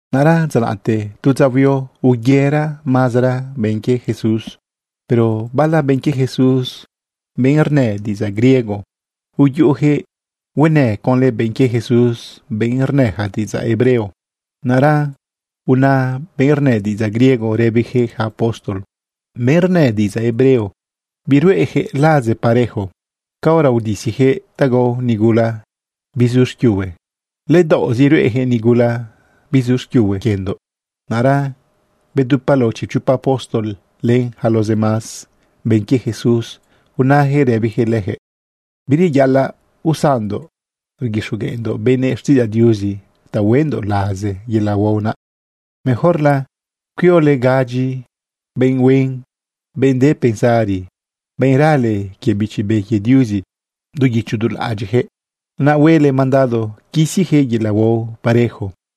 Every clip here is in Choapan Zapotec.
Naꞌra dza naꞌte, tu dza huio, uyera mazera benꞌ quie Jesús. Pero bala benꞌ quie Jesús, benꞌ rnë diꞌidzaꞌ griego, uyuꞌuyaquëꞌ huenë conlë benꞌ quie Jesús, benꞌ rnëja diꞌidzaꞌ hebreo. Naꞌra una benꞌ rnë diꞌidzaꞌ griego rëbiyaquëꞌ yaca apóstol: ―Benꞌ rnë diꞌidzaꞌ hebreo, biruꞌeyaquëꞌ laze parejo. Caora udisiyaquëꞌ ta gao nigula bizu xquiuhue, ledaoꞌzi ruꞌeyaquëꞌ nigula bizu xquiuhue quiendoꞌ. Naꞌra bedupa lao chipchopa apóstol len yaca los demás benꞌ quie Jesús, unayaquëꞌ rëbiyaquëꞌ leyaquëꞌ: ―Bireyaꞌalaꞌ usanndoꞌ rguixogueꞌndoꞌ benëꞌ xtiꞌidzaꞌ Diuzi ta hueꞌndoꞌ laze yelaꞌ huao naꞌ. Mejorla cuiole gadyi benꞌ huen, benꞌ de pensari, benꞌ rale quie Bichi Be quie Diuzi du guicho du laꞌadyiꞌyaquëꞌ, naꞌ huele mandado quisiyaquëꞌ yelaꞌ huao parejo.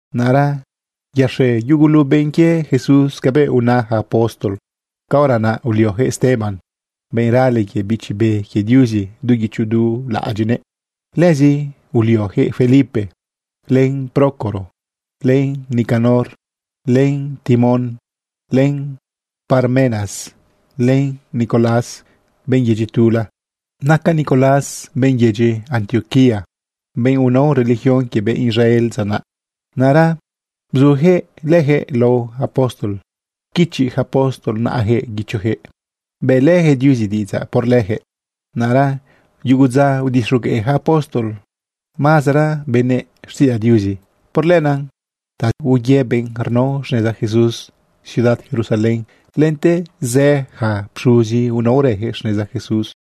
Naꞌra yaxe yugulu benꞌ quie Jesús cabëꞌ una yaca apóstol. Caora naꞌ ulioyaquëꞌ Esteban, benꞌ rale quie Bichi Be quie Diuzi du guicho du laꞌadyiꞌnëꞌ. Lëzi ulioyaquëꞌ Felipe, len Prócoro, len Nicanor, len Timón, len Parmenas, len Nicolás benꞌ yedyi tula. Naca Nicolás benꞌ yedyi Antioquía, benꞌ unao religión quie benꞌ Israel dza naꞌ. Naꞌra bzuyaquëꞌ leyaquëꞌ lao yaca apóstol, pquichi yaca apóstol naꞌayaquëꞌ guichojëꞌ, bëꞌlëyaquëꞌ Diuzi diꞌidzaꞌ por leyaquëꞌ. Naꞌra yugu dza udixogueꞌ ja apóstol mazera benëꞌ xtiꞌidzaꞌ Diuzi. Por lenaꞌ taz̃e uye benꞌ rnao xneza Jesús ciudad Jerusalén. Lente zë yaca pxuzi, unaorëyaquëꞌ xneza Jesús.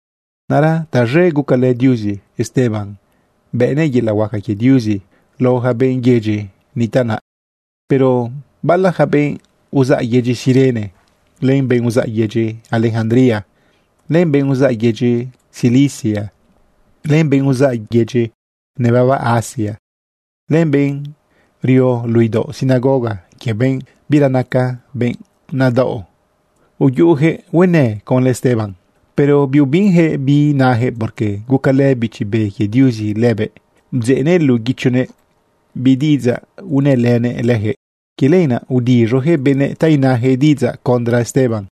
Naꞌra taz̃e gucalë Diuzi Esteban bënëꞌ yelaꞌ huaca quie Diuzi lao ja benꞌ yedyi nitaꞌ naꞌ. Pero bala ja benꞌ uzaꞌ yedyi Cirene, len benꞌ uzaꞌ yedyi Alejandría, len benꞌ uzaꞌ yedyi Cilicia, len benꞌ uzaꞌ yaca yedyi nebaba Asia, len benꞌ rio luꞌu idaoꞌ sinagoga quie benꞌ bira naca benꞌ nadaꞌo, uyuꞌuyaquëꞌ huenë conlë Esteban. Pero biubinyaquëꞌ bi nayaquëꞌ porque gucalë Bichi Be quie Diuzi lëbëꞌ bdzeꞌnëꞌ luꞌu guichonëꞌ bi diꞌidzaꞌ unëlënëꞌ leyaquëꞌ. Quie lenaꞌ udiz̃oyaquëꞌ benëꞌ ta inayaquëꞌ diꞌidzaꞌ contra Esteban.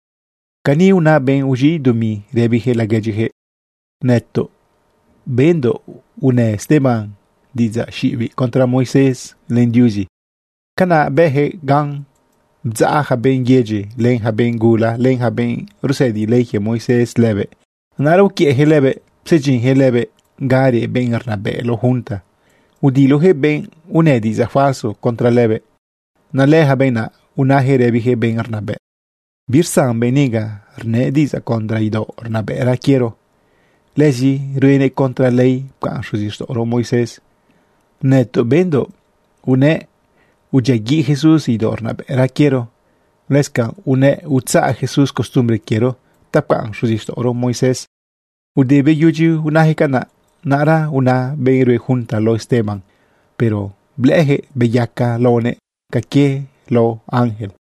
Caniꞌ una benꞌ uz̃iꞌ dumi rëbiyaquëꞌ laguedyiyaquëꞌ: ―Nëtoꞌ bendoꞌ unë Esteban diꞌidzaꞌ xiꞌibiꞌ contra Moisés len Diuzi. Canaꞌ bëjëꞌ gan bdzaꞌ ja benꞌ yedyi, len ja benꞌ gula, len ja benꞌ rusëdi ley quie Moisés lëbëꞌ. Naꞌra uquiëꞌyaquëꞌ lëbëꞌ, psedyinyaquëꞌ lëbëꞌ ga reꞌ benꞌ rnabëꞌ lao junta. Udiloyaquëꞌ benꞌ unë diꞌidzaꞌ falso contra lëbëꞌ. Naꞌ lëyaca benꞌ naꞌ, unayaquëꞌ rëbiyaquëꞌ benꞌ rnabëꞌ: ―Birsan benꞌ niga rnëꞌ diꞌidzaꞌ contra idaoꞌ rnabëꞌra quiero. Lëzi ruenëꞌ contra ley pcaꞌn xuzixtaꞌoro Moisés. Nëtoꞌ bendoꞌ unëꞌ udyiaguiꞌ Jesús idaoꞌ rnabëꞌra quiero. Lëscanꞌ unëꞌ utzaꞌ Jesús costumbre quiero ta pcaꞌn xuzixtaꞌoro Moisés. Ude beyudyi unajëꞌ canaꞌ, naꞌra unaꞌ benꞌ rue junta lao Esteban, pero blëꞌëyaquëꞌ beyaca laonëꞌ ca quie lao ángel.